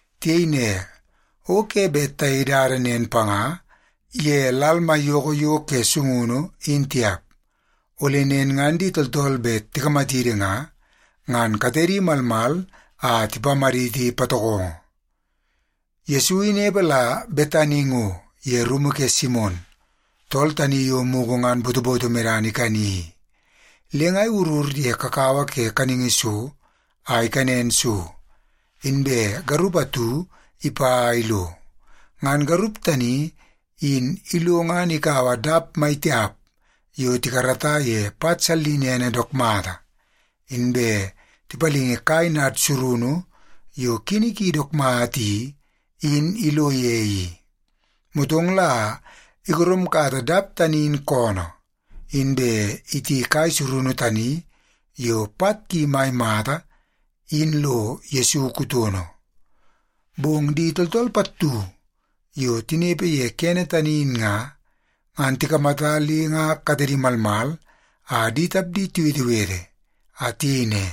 Tiyei ne, “O ke bet tayei dada nen panga ye lal maiyoko yo ke sungunu in tiap, ole nen ngan di tooltool bet tikamatidi nga, ngan katedi malmal a tipamaditi patokongo.” Yesu inepe la Betani ngo ye rumu ke Simon, tool tani yo mugu ngan botoboto medana ikani i. Le nga iwurur ye kakawa ke kaningi so a ikanen so, inbe garup atu ipa a ilo. Ngan garup tani in ilo ngan ikaua dap maitiap yo tikarata ye pat sallinene dook mata, inbe tipalingi kai nad surunu yo kini ki dook mata i, in ilo ye i. Motong la igoromkata dap tani in koonoo, inbe iti kai surunu tani yo pat ki mai mata in lo Yesu kutono. Bong di tooltool pattu yo tinepe ye kene tani in nga, ngan tikamata le nga katedi malmal a di tapdi tiwetewete a tiyei ne,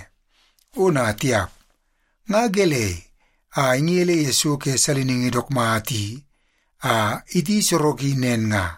“Ona tiap, nga gelei a ingele ye so ke saliningi dook mata i a iti soroki nen nga?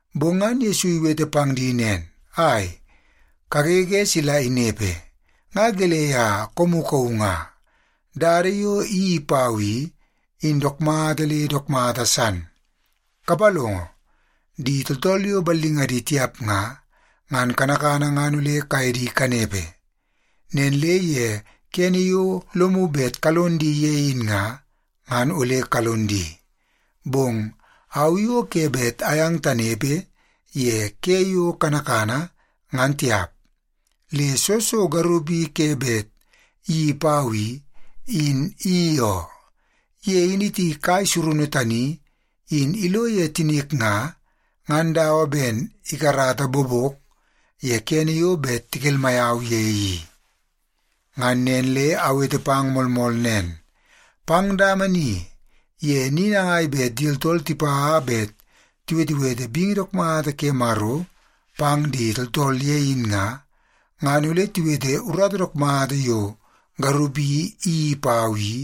Bong ngan Yesu iwete pang di nen “Ai, kagege sila inepe! Nga gelei a koomu kauu nga? Dada yo iyeii pau i, in dook mata le dook mata san. Kapalongo, di tooltool yo ballingadi tiap nga, ngan kanakana ngan ole kaye di kanepe. Nen le ye kene yo lomu bet kalon di ye in nga, ngan ole kalon di. Bong au i o ke bet ayang tanepe ye ke yo kanakana, ngan tiap. Le soo so garup i ke bet iyeii pau i, in iyeii oo. Ye in iti kai surunu tani in ilo ye tinik nga, ngan dawa ben ikarata bobok ye kene yo bet tikelmai au ye i. Ngan nen le awete pang moolmool nen, pang dama ni ye ni nangai bet di tooltool tipa bet tiwetewete bingi dook mata ke Maro pang di tooltool ye in nga, ngan ole tiwete urata dook mata yo garup i iyeii pau i,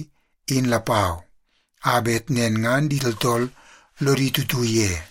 in lapau, a bet nen ngan di tooltool lodi tutu ye.”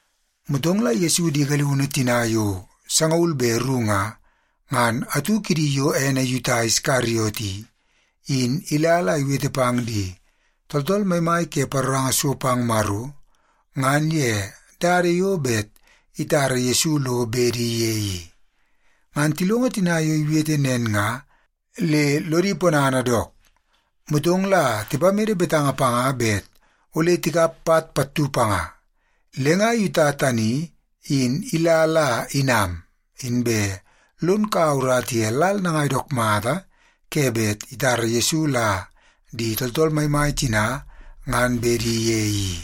Motong la Yesu di galiunu tina yo sangaul be ru nga, ngan atu kidi yo ene Yuta Iskariot i, in ila la iwete pang di tooltool maimai ke paroranga so pang Maro ngan ye dada yo bet itara Yesu lo bedi ye i. Ngan tilongo tina yo iwete nen nga le lodi ponana dook, motong la tipamede betanga panga bet ole tikap pat pattu panga. Le nga Yuta tani in ila la inam, inbe lon kaua urata ye lal nangai dook mata ke bet itara Yesu la di tooltool maimai tina ngan bedi ye i.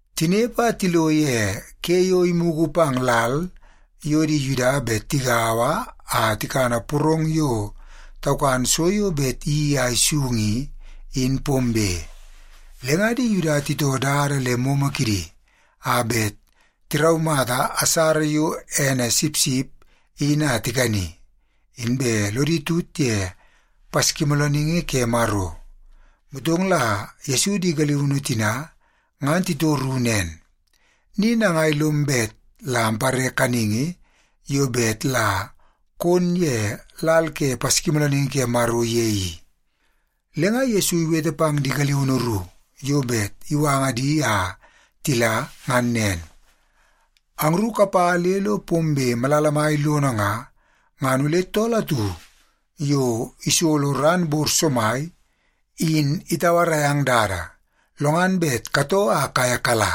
Tinepe a tilo ye ke yo imugu pang lal yo di Yuda bet tigaua a tikana porong yo taukan so yo bet iyeii a isung i, in pombe. Le nga di Yuda titoo dada le momo kidi a bet tiraumata asara yo ene sipsip in a tikani, inbe lodi tut ye Paskimoolooningi ke Maro. Motong la Yesu di galiunu tina ngan titoru nen, “Ni nangai lom bet la ampare kaningi yo bet la kon ye lal ke Paskimoolooningi ke Maro ye i?” Le nga Yesu iwete pang di galiunu ru yo bet iwanga di a tila ngan nen, “Angru kapa le lo pombe malala mai lono nga, ngan ole tool atu yo isolo ran bor somai in itauarai ang dada, lo ngan bet katoo a kaye kala.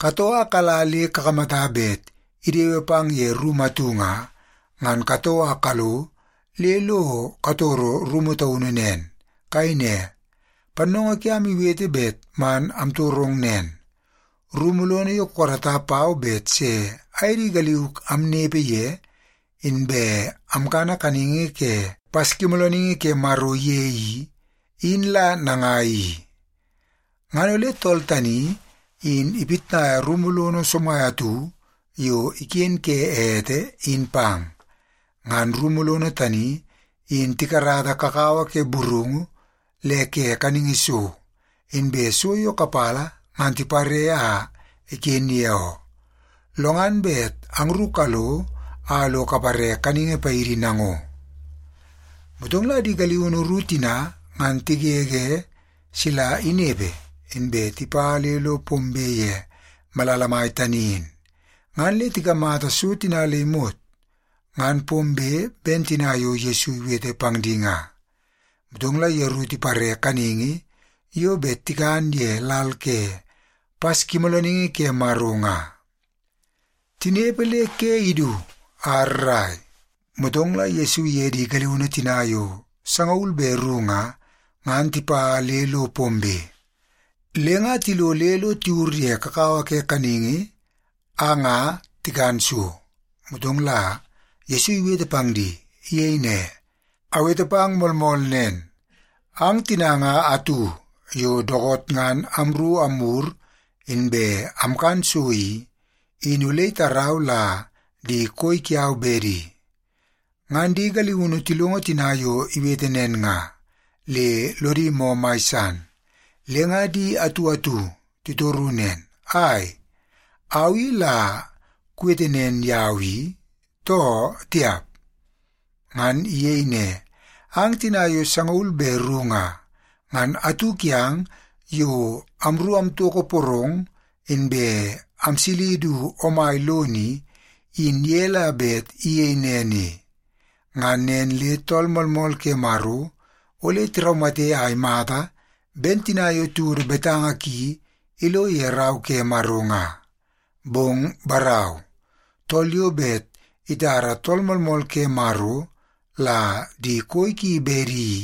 Katoo a kala le kakamata bet idewe pang ye rumu atu nga, ngan katoo a kalo le lo katoro rumu taunu nen. Kayei ne, ‘Pannoongoo kiam iwete bet man amtorong nen: Rumu lono yo kukarata pau bet se aye di galiuk amnepe ye inbe amkana kaningi ke Paskimoolooningi ke Maro ye i, in la nangai i?’ Ngan ole tool tani in ipitnaia rumu lono somai atu yo iken ke ete, in pang. Ngan rumu lono tani in tikarata kakawa ke burungu le ke kaningi so, inbe so yo kapala ngan tipare a iken ye oo. Lo ngan bet angru kalo a lo kapare kaningi paidi nango.” Motong la di galiunu ru tina ngan tigege sila inepe, inbe tipa le lo pombe ye malala mai tani in. Ngan le tikamata so tina le imot ngan pombe ben tina yo Yesu iwete pang di nga. Motong la yeru tipare kaningi yo bet tikan ye lal ke Paskimoolooningi ke Maro nga. Tinepe le ke idu a rrai, motong la Yesu iye di galiunu tina yo sangaul be ru nga, ngan tipa le lo pombe. Le nga tilo le lo tiwur ye kakawa ke kaningi a nga tikan so, motong la Yesu iwete pang di. Iyei ne, “Awete pang moolmool nen, ang tina nga atu yo dookoot ngan amru amwur inbe amkan so i, in ole itarau la di koi kiau bedi.” Ngan di galiunu tilongo tina yo iwete nen nga, le lodi moo mai san. Le nga di atu atu titoru nen, “Ai, au i la kuwete nen yau i, too tiap?” Ngan iyei ne, “Ang tina yo sangaul be ru nga, ngan atu kiang yo amru amtoko porong inbe amsili du omai lono i, in ye la bet iyei nen i. Ngan nen le Tool Moolmool ke Maro ole tiraumate a imata ben tina yo tiwodo betanga ki lo ye Rau ke Maro nga. Bong barau, tool yo bet itara Tool Moolmool ke Maro la di koi ki bedi i,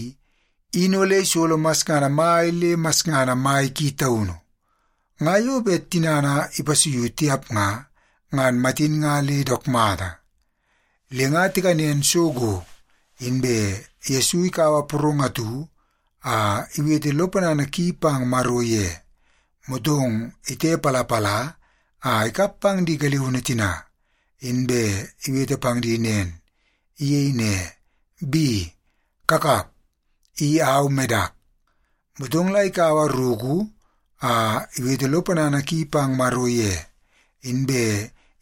in ole isolo masngana mai le masngana mai ki taunu. Nga yo bet tinana ipasuiu tiap nga, ngan matin nga le dook mata.” Le nga tikanen so go, inbe Yesu ikaua porong atu a iwete lo ponana ki pang Maro ye, motong itepalapala a ikap pang di galiunu tina, inbe iwete pang di nen. Iyei ne, “Bi, kakap. I au medak.” Motong la ikaua ruku a iwete lo ponana ki pang Maro ye, inbe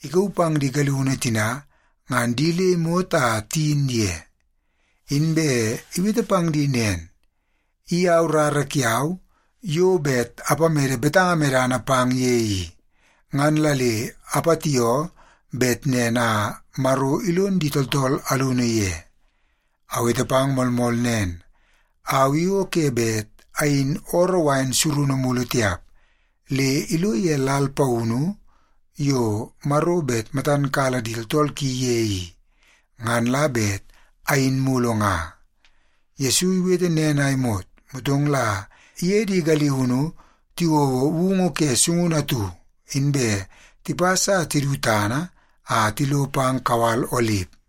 ikauu pang di galiunu tina ngan di le imot a tiyin ye. Inbe iwete pang di nen, “I au rara kiau yo bet apamede betanga medana pang ye i. Ngan la le apatioo bet nen a Maro ilon di tooltool alunu ye. Awete pang moolmool nen, au i o ke bet ayin ooroo wain surunu mulu tiap, le ilo ye lal paunu yo Maro bet matan kala di tooltool ki ye i, ngan la bet ayin mulu nga.” Yesu iwete nen a imot, motong la iye di galiunu tiwouo woungu ke sungunu atu, inbe tipas a tidu tana a tilo pang kawal Olip.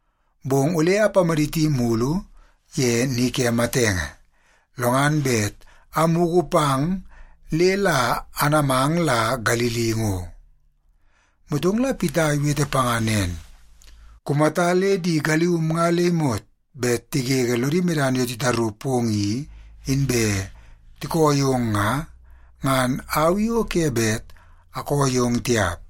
Bong ole amadit mulu ye ni ke matenge, lo ngan bet amugu pang le la anamang la Galili ngo.” Motong la Pita iwete panga nen, “Kumata le di galium nga le imot bet tigege lodi medana yo titaru pong i, inbe tikoo yong nga, ngan au i o ke bet akoo yong tiap.”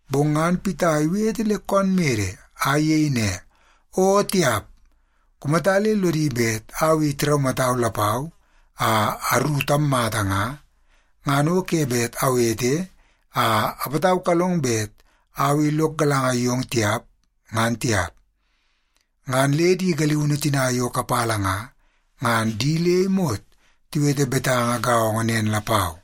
Bong ngan Pita iwete le koon mede a iyei ne, “O tiap! Kumata le lodi bet au i tiraumatau lapau a aru tammata nga, ngan o ke bet awete a apataukalong bet au i lok galanga yong tiap, ngan tiap.” Ngan le di galiunu tina yo kapala nga, ngan di le imot tiwete betanga gaongo nen lapau.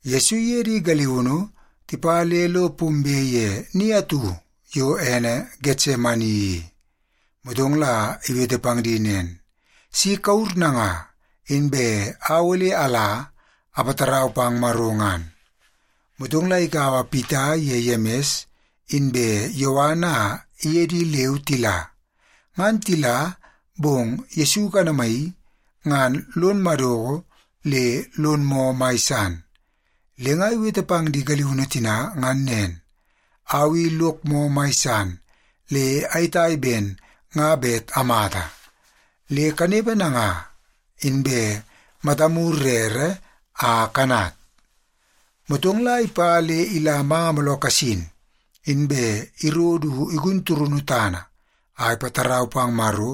Yesu iye di galiunu tipa le lo pombe ye ni atu yo ene Getsemani i. Motong la iwete pang di nen, “Si kawur nanga, inbe au ole ala apatarau pang Maro ngan.” Motong la ikaua Pita iye Yemis inbe Yowan a iye di leu tila. Ngan tila, bong Yesu ikanamaii, ngan lon madoko le lon moo mai san. Le nga iwete pang di galiunu tina ngan nen, “Au i lok moo mai san le ayetai ben nga bet amata. Le kanepe nanga, inbe matamu rere a kanat.” Motong la ipa le ila manga mooloo kasin, inbe iro du igun turunu tana a ipatarau pang Maro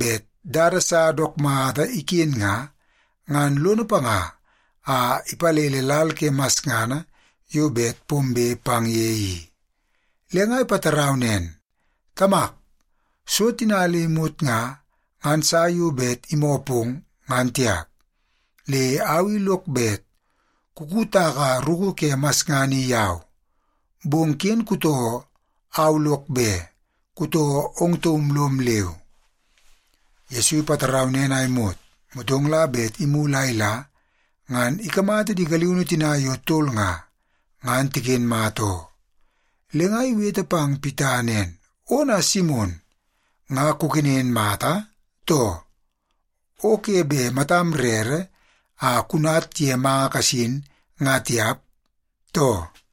bet dada sa dook mata iken nga, ngan lono panga a ipalele lal ke masngana yo bet pombe pang ye i. Le nga ipatarau nen, “Tamak, so tina le imot nga, ngan sa yo bet imoo pong, ngan tiap. Le au i lok bet kukutaka ruku ke masngana i yau. Bong ken kutoo au lok be, kutoo ong taum lom leu.” Yesu ipatarau nen a imot, motong la bet imulu a ila, ngan ikamata di galiunu tina yo tol nga, ngan tiken mata oo. Le nga iwete pang Pita nen, “Ona Simon, nga kukenen mata, too? O ke bet matam rere a kunat ye manga kasin nga tiap, too?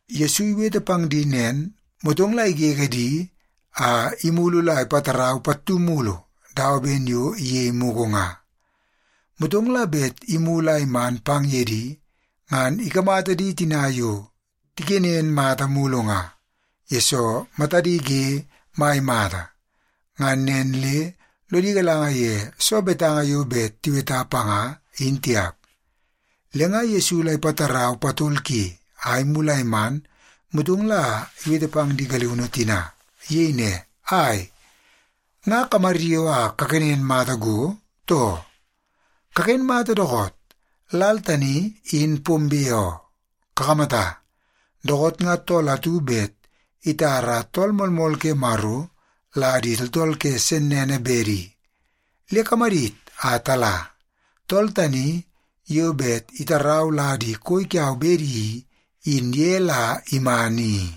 Yesu iwete pang di nen, motong la igege di a imulu la ipatarau pattu mulu dawa ben yo iyei mugu nga. Motong la bet imulu a iman pang ye di, ngan ikamata di tina yo tikenen mata mulu nga, yesoo matadi ge mai mata. Ngan nen le lodi galanga ye soo betanga yo bet tiweta panga, in tiap. Le nga Yesu la ipatarau patol ki a imulu a iman, motong la iwete pang di galiunu tina. Iyei ne, “Ai, nga kamaryoo a kakenen mata go, too? Kaken mata dookoot! Lal tani in pombe oo. Kakamata, dookoot nga tool atu bet itara Tool Moolmool ke Maro la di tooltool ke sennene bedi. Le kamadit a tala! Tool tani yo bet itarau la di koi kiau bedi i, in ye la iman i.”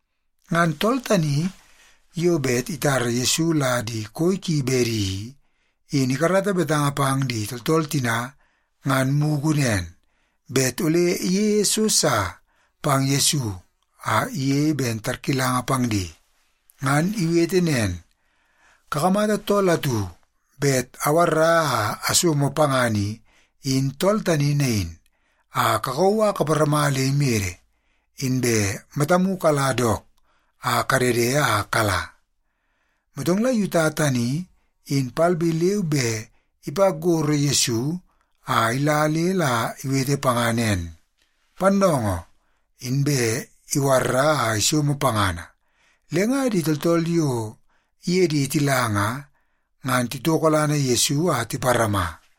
Ngan tool tani yo bet itara Yesu la di koi ki bedi i, in ikarata betanga pang di tooltool tina ngan mugu nen, bet ole iyeie so sa pang Yesu a iyei ben tarkilanga pang di. Ngan iwete nen, “Kakamata tool atu bet awarra a asomo pangana i, in tool tani nain, a kakauu a kaparama le imede, inbe matamu kala dook a kadede a kala.” Motong la Yuta tani in palbe leu be ipa gorro Yesu a ila le la iwete panga nen, “Pannoongoo!” Inbe iwarra a isomo pangana. Le nga di tooltool yo iye di tila nga, ngan titokolana Yesu a tiparama.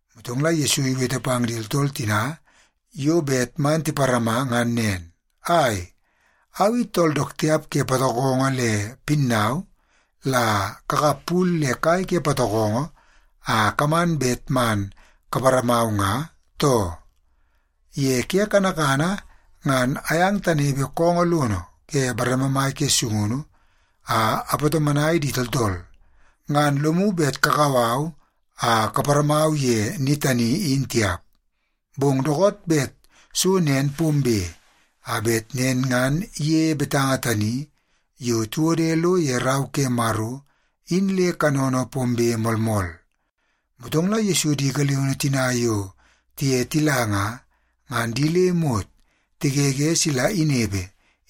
Motong la Yesu iwete pang di tooltool tina yo bet man tiparama ngan nen, “Ai, au i tool dook tiap ke patokongo le pinnau la kakap pul le kai ke patokongo a kaman bet man kaparamau nga, too? Ye ke kanakana ngan ayang tanepe koongoo lono ke bareme mai ke sungunu a apatomonai di tooltool, ngan lomu bet kakau au a kaparamau ye ni tani in tiap. Bong dookoot bet so nen pombe, a bet nen ngan iyeie betanga tani yo tiwode lo ye Rau ke Maro in le kanono pombe moolmool.” Motong la Yesu di galiunu tina yo tiye tila nga, ngan di le imot tigege sila inepe,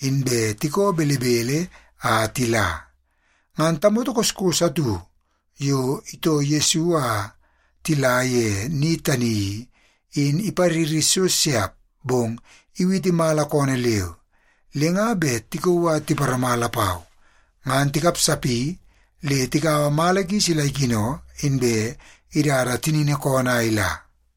inbe tikoo belebele a tila. Ngan tamoto koskos atu yo itoo Yesu a tila ye ni tani i, in ipariri so siap bong iwiti mala koonoo leu. Le nga bet tikauu a tiparama lapau, ngan tikapsapi le tikaua mala ki sila ikino, inbe idada tinini koonoo a ila.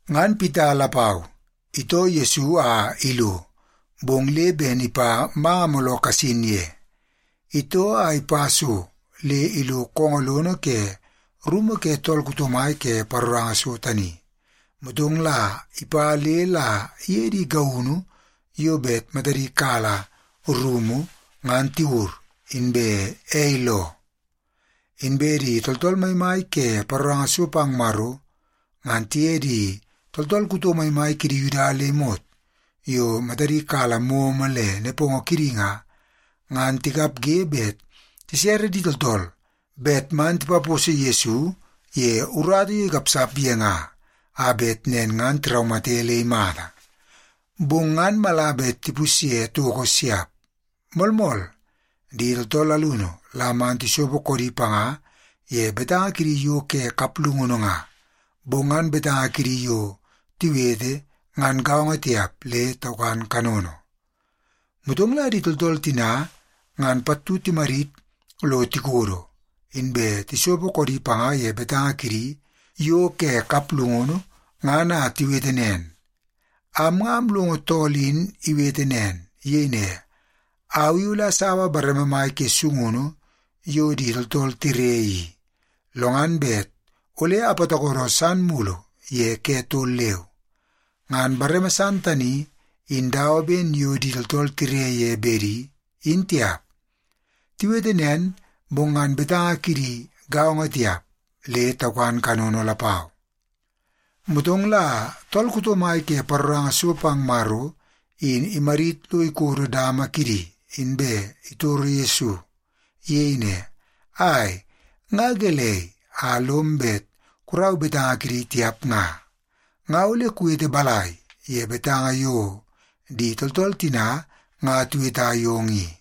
Ngan Pita lapau itoo Yesu a ilo, bong le ben ipa manga mooloo kasin ye. Itoo a ipa so le ilo koongoo lono ke rumu ke tool kuto mai ke paroranga so tani, motong la ipa le la iye di gaunu yo bet matadi kala rumu ngan tiwur, inbe ei loo. Inbe di tooltool maimai ke paroranga so pang Maro, ngan tiye di tooltool kuto maimai kidi Yuda le imot yo matadi kala momo le nepongo kidi nga, ngan tikapge bet tisere di tooltool bet man tipaposo Yesu ye urata yo ikapsap ye nga, a bet nen ngan tiraumate le imata. Bong ngan mala bet tipusye toko siap. Moolmool, di tooltool alunu la man tisopo koodi panga ye betanga kidi yo ke kaplungunu nga, bong ngan betanga kidi yo tiwete ngan gaongo tiap le taukan kanono. Motong la di tooltool tina ngan pattu timadit lo tikodo, inbe tisopo koodi panga ye betanga kidi yo ke kaplungunu ngan a tiwete nen, “Am nga amlongo tool in iwete nen. Iyei ne, ‘Au i ole asaua bareme mai ke sungunu yo di tooltool tire i, lo ngan bet ole apatokodo san mulu ye ke tol leu. Ngan bareme san tani, in dawa ben yo di tooltool tire ye bedi, in tiap.’” Tiwete nen, bong ngan betanga kidi gaongo tiap, le taukan kanono lapau. Motong la tool kuto mai ke paroranga so pang Maro in imadit lo ikodo dama kidi, inbe itoro Yesu. Iyei ne, “Ai, nga gelei a lom bet kurau betanga kidi tiap nga? Nga ole kuwete balai ye betanga yo di tooltool tina nga tiweta yong i?”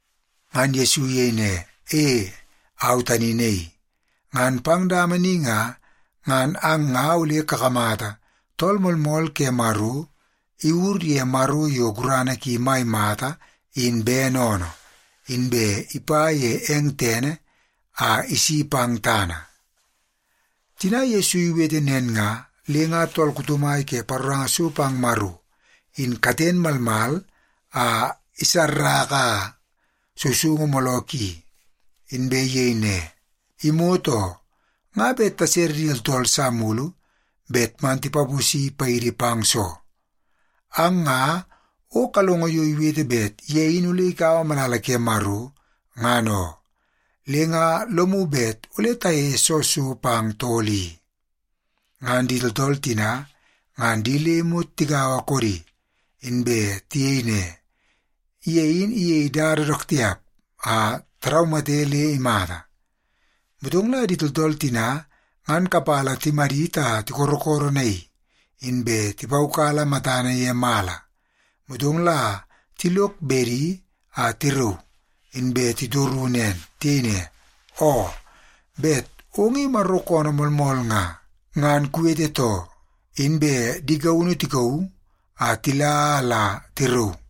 Ngan Yesu iyei ne, “E, au tani naii. Ngan pang dama ni nga, ngan ang nga ole kakamata Tool Moolmool ke Maro iwur ye Maro yo gurana ki mai mata in bene oonoo, inbe ipa ye eng tene a isi pang tana.” Tina Yesu iwete nen nga, le nga tool kuto mai ke paroranga so pang Maro in katen malmal a isarraka sousoungu mooloo ki, inbe iyei ne, “Imot oo! Nga bet tasere di tooltool sa mulu bet man tipaposi paidi pang soo? Ang nga o kalongo yo iwete bet ye in ole ikaua malala ke Maro, ngan oo. Le nga lomu bet ole tayeie soo so pang tool i?” Ngan di tooltool tina ngan di le imot tigaua koodi, inbe tiyei ne, “Ye in iyei dada dook tiap a taraumate le imata.” Motong la di tooltool tina ngan kapala timadit a tikorokoronaii, inbe tipaukala matana ye mala, motong la tilok bedi a tirauu, inbe titoru nen. Tiyei ne, “Oo, bet ong i Maro koonoo moolmool nga, ngan kuwete too.” Inbe di gaunu tikauu a tila a la tirauu.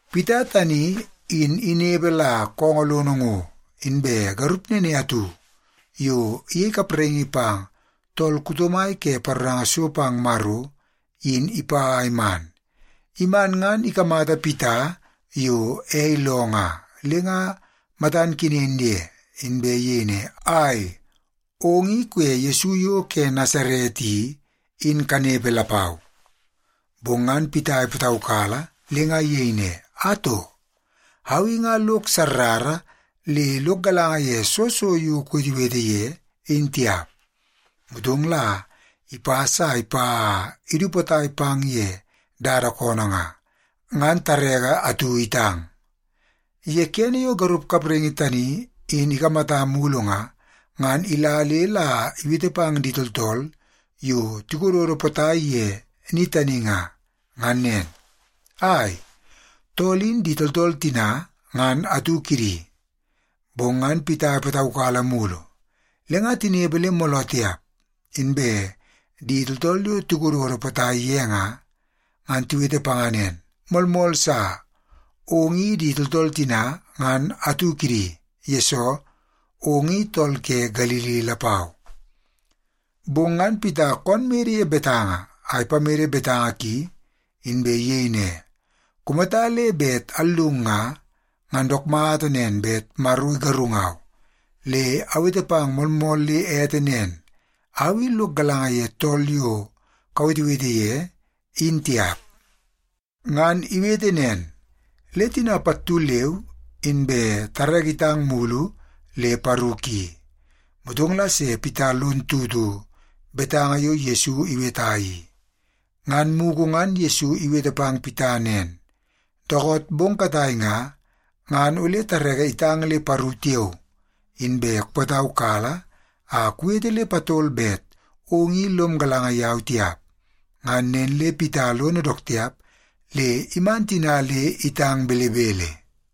Pita tani in inepe la koongoo lono ngo, inbe garup nene atu yo iyei kapraingi pang tool kuto mai ke paroranga so pang Maro, in ipa a iman. Iman ngan ikamata Pita yo ei loo nga, le nga matan kenen ye, inbe iyei ne, “Ai, ong i kuye Yesu yo ke Nasaret i, in kanepe lapau.” Bong ngan Pita ipataukala le nga iyei ne, “Atoo, au i nga lok sarara le lok galanga ye soo so yo kuwetewete ye, in tiap.” Motong la ipas a ipa a idu potai pang ye dada koonoo nga, ngan tareke atu itang. Ye kene yo garup kapraingi tani in ikamata mulu nga, ngan ila le la iwete pang di tooltool yo tikododo potai ye ni tani nga, ngan nen, “Ai, tool in di tooltool tina ngan atu kidi.” Bong ngan Pita ipataukala mulu. Le nga tinepe le mooloo tiap, inbe di tooltool yo tikododo potai ye nga, ngan tiwete panga nen, “Moolmool sa, ong i di tooltool tina ngan atu kidi, yesoo ong i tool ke Galili lapau.” Bong ngan Pita koonoo mede ye betanga a ipamede betanga ki, inbe iyei ne, “Kumata le bet allung nga, ngan dook mata nen bet Maro igarungau. Le awete pang moolmool le ete nen, au i lok galanga ye tool yo kawetewete ye, in tiap.” Ngan iwete nen, le tina pattu leu inbe tareke itang mulu le paru ki. Motong la se Pita lon tutu betanga yo Yesu iweta i. Ngan mugu ngan Yesu iwete pang Pita nen, “Dookoot bong katai nga, ngan ole tareke itang le paru tiao, inbe kupataukala a kuwete le patol bet ong i lom galanga yau tiap.” Ngan nen le Pita lono dook tiap le iman tina le itang belebele.